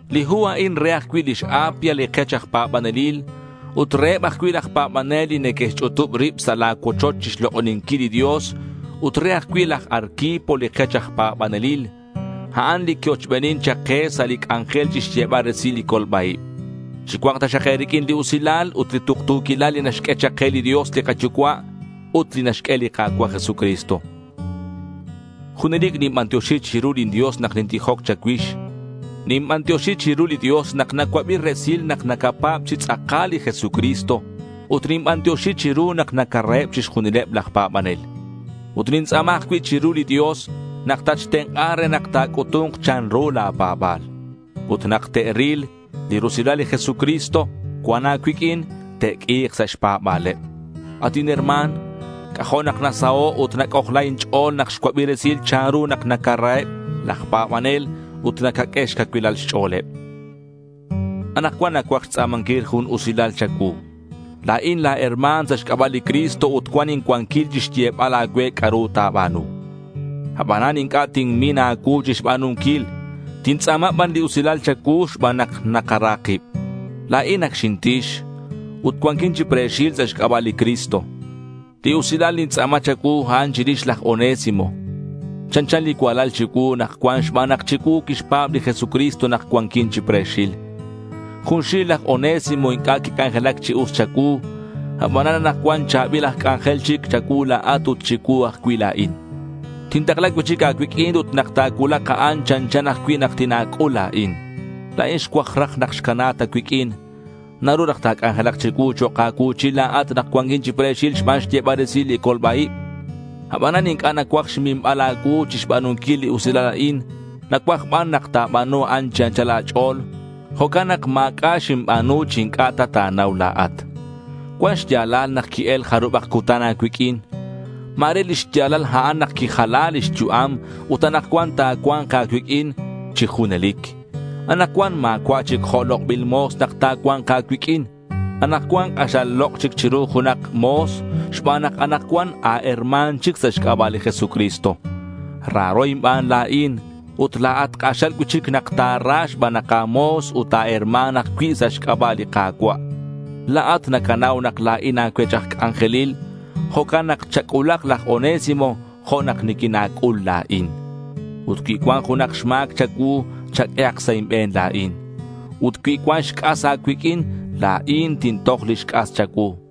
Li hu a'in re ajcui' lix Apia, li kech aj pa̱banelil ut reheb ajcui' laj pa̱banel li neque'xch'utub rib sa' la̱ cuochoch chixlok'oninquil li Dios, ut re ajcui' laj Arquipo li kech aj pa̱banelil. A'an li qui-ochbenin chak ke sa' li c'anjel chixyebal resil li colba-ib. Chicua̱nk taxak e̱riq'uin li usilal ut li tuktu̱quilal li naxq'ue chak ke li Dios li kaYucua' ut li naxq'ue li Ka̱cua' Jesucristo. Junelic ninbantioxi chiru lin Dios nak nintijoc cha̱cuix. Ninbantioxi chiru li Dios nak nacuabi resil nak nacapa̱b chi tz'akal li Jesucristo ut ninbantioxi chiru nak nacaraheb chixjunileb laj pa̱banel. Ut nintz'a̱ma ajcui' chiru li Dios nak tatxtenk'a re nak ta̱c'utu̱nk chanru la̱ pa̱ba̱l. Ut nak te'ril li rusilal li Jesucristo cuan a̱cuiq'uin, te'q'ui̱k sa' xpa̱ba̱leb. At inherma̱n, c'ajo' nak nasaho' ut nac'ojla inch'o̱l nak xcuabi resil chanru nak nacaraheb laj pa̱banel ut nacaq'ue xcacuilal xch'o̱leb. Anakcuan nacuaj xtz'a̱manquil jun usilal cha̱cuu. La̱in la̱ herma̱n sa' xc'aba' li Cristo ut cuan incuanquil chixyebal a̱cue c'a'ru ta̱ba̱nu. Abanan inc'a' tinmin a̱cuu chixba̱nunquil. Tintz'a̱ma ban li usilal cha̱cuu xban nak nakara kib. La̱in ac xinti̱x ut cuanquin chi pre̱xil sa' xc'aba' li Cristo. Li usilal nintz'a̱ma cha̱cuu, a'an chirix laj Onésimo. Chanchan li cualal chicuu nak cuan xban nak chicuu quixpa̱b li Jesucristo nak cuanquin chi pre̱xil. Junxil laj Onésimo inc'a' quic'anjelac chi us cha̱cuu. Abanan anakcuan cha̱bil aj c'anjel chic cha̱cuu la̱at ut chicuu ajcui' la̱in. Tintakla cui'chic a̱cuiq'uin ut nak ta̱c'ul a'an, chanchan ajcui' nak tina̱c'ul la̱in. La̱in xcuaj raj nak xcana ta cuiq'uin. Naru raj ta̱c'anjelak chicuu chok' a̱cuu̱chil la̱at nak cuanquin chi pre̱xil xban xyebal resil li colba-ib. Abanan inc'a' nacuaj xminbal a̱cuu chixba̱nunquil li usilal a'in. Nacuaj ban nak ta̱ba̱nu a'an chi anchal a̱ch'o̱l. Jo'can nak ma̱c'a' xinba̱nu chi inc'a' ta ta̱nau la̱at. Cuan xya̱lal nak qui-el jarubak cutan a̱cuiq'uin. Ma̱re lix ya̱lal a'an nak quijala lix yu'am ut anakcuan ta̱cua̱nk a̱cuiq'uin chi junelic. Anakcuan ma̱cua' chic jo' lok'bil mo̱s nak ta̱cua̱nk a̱cuiq'uin. Anakcuan k'axal lok' chic chiru junak mo̱s xban nak anakcuan a̱herma̱n chic sa' xc'aba' li Jesucristo. Raro inban la̱in, ut la̱at k'axal cui'chic nak ta̱ra xban nak a̱mo̱s ut a̱herma̱n ajcui' sa' xc'aba' li Ka̱cua'. La̱at nacanau nak la̱in a̱cuech aj c'anjelil. Jo'can nak chac'ulak laj Onésimo jo' nak niquina̱c'ul la̱in. Ut cui cuan junak xma̱c cha̱cuu, chaq'uehak sa' inbe̱n la̱in. Ut cui cuan xc'as a̱cuiq'uin, la̱in tintoj lix c'as cha̱cuu.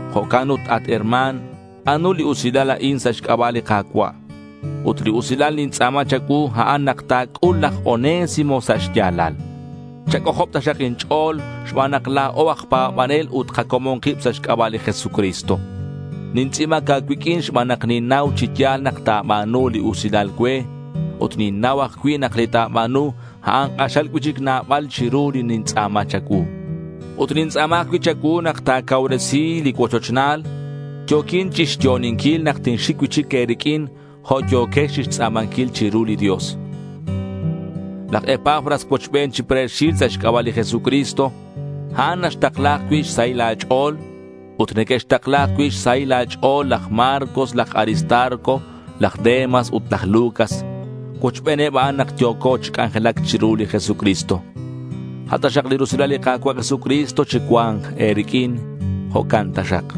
Jo'can ut herma̱n, ba̱nu li usilal a'in sa' xc'aba' li Ka̱cua'. Ut li usilal nintz'a̱ma cha̱cuu, a'an nak ta̱c'ul laj Onésimo sa' xya̱lal. Chac'ojob taxak inch'o̱l xban nak la̱o aj pa̱banel ut kacomon kib sa' xc'aba' li Jesucristo. Nintz'i̱bac a̱cuiq'uin xban nak ninnau chi ya̱l nak ta̱ba̱nu li usilal cue. Ut ninnau ajcui' nak li ta̱ba̱nu, a'an k'axal cui'chic nabal chiru li nintz'a̱ma cha̱cuu. Ut nintz'a̱ma ajcui' cha̱cuu nak ta̱cauresi li cuochochnal. Yo̱quin chixyo'oninquil nak tinxic cui'chic e̱riq'uin jo' yo̱quex chixtz'a̱manquil chiru li Dios. Laj Epafras cuochben chi pre̱xil sa' xc'aba' li Jesucristo. A'an naxtakla ajcui' xsahil a̱ch'o̱l. Ut neque'xtakla ajcui' xsahil a̱ch'o̱l laj Marcos, laj Aristarco, laj Demas ut laj Lucas. Cuochbeneb a'an nak yo̱co chi c'anjelac chiru li Jesucristo. A' taxak li rusilal li Ka̱cua' Jesucristo chicua̱nk e̱riq'uin. Jo'can taxak.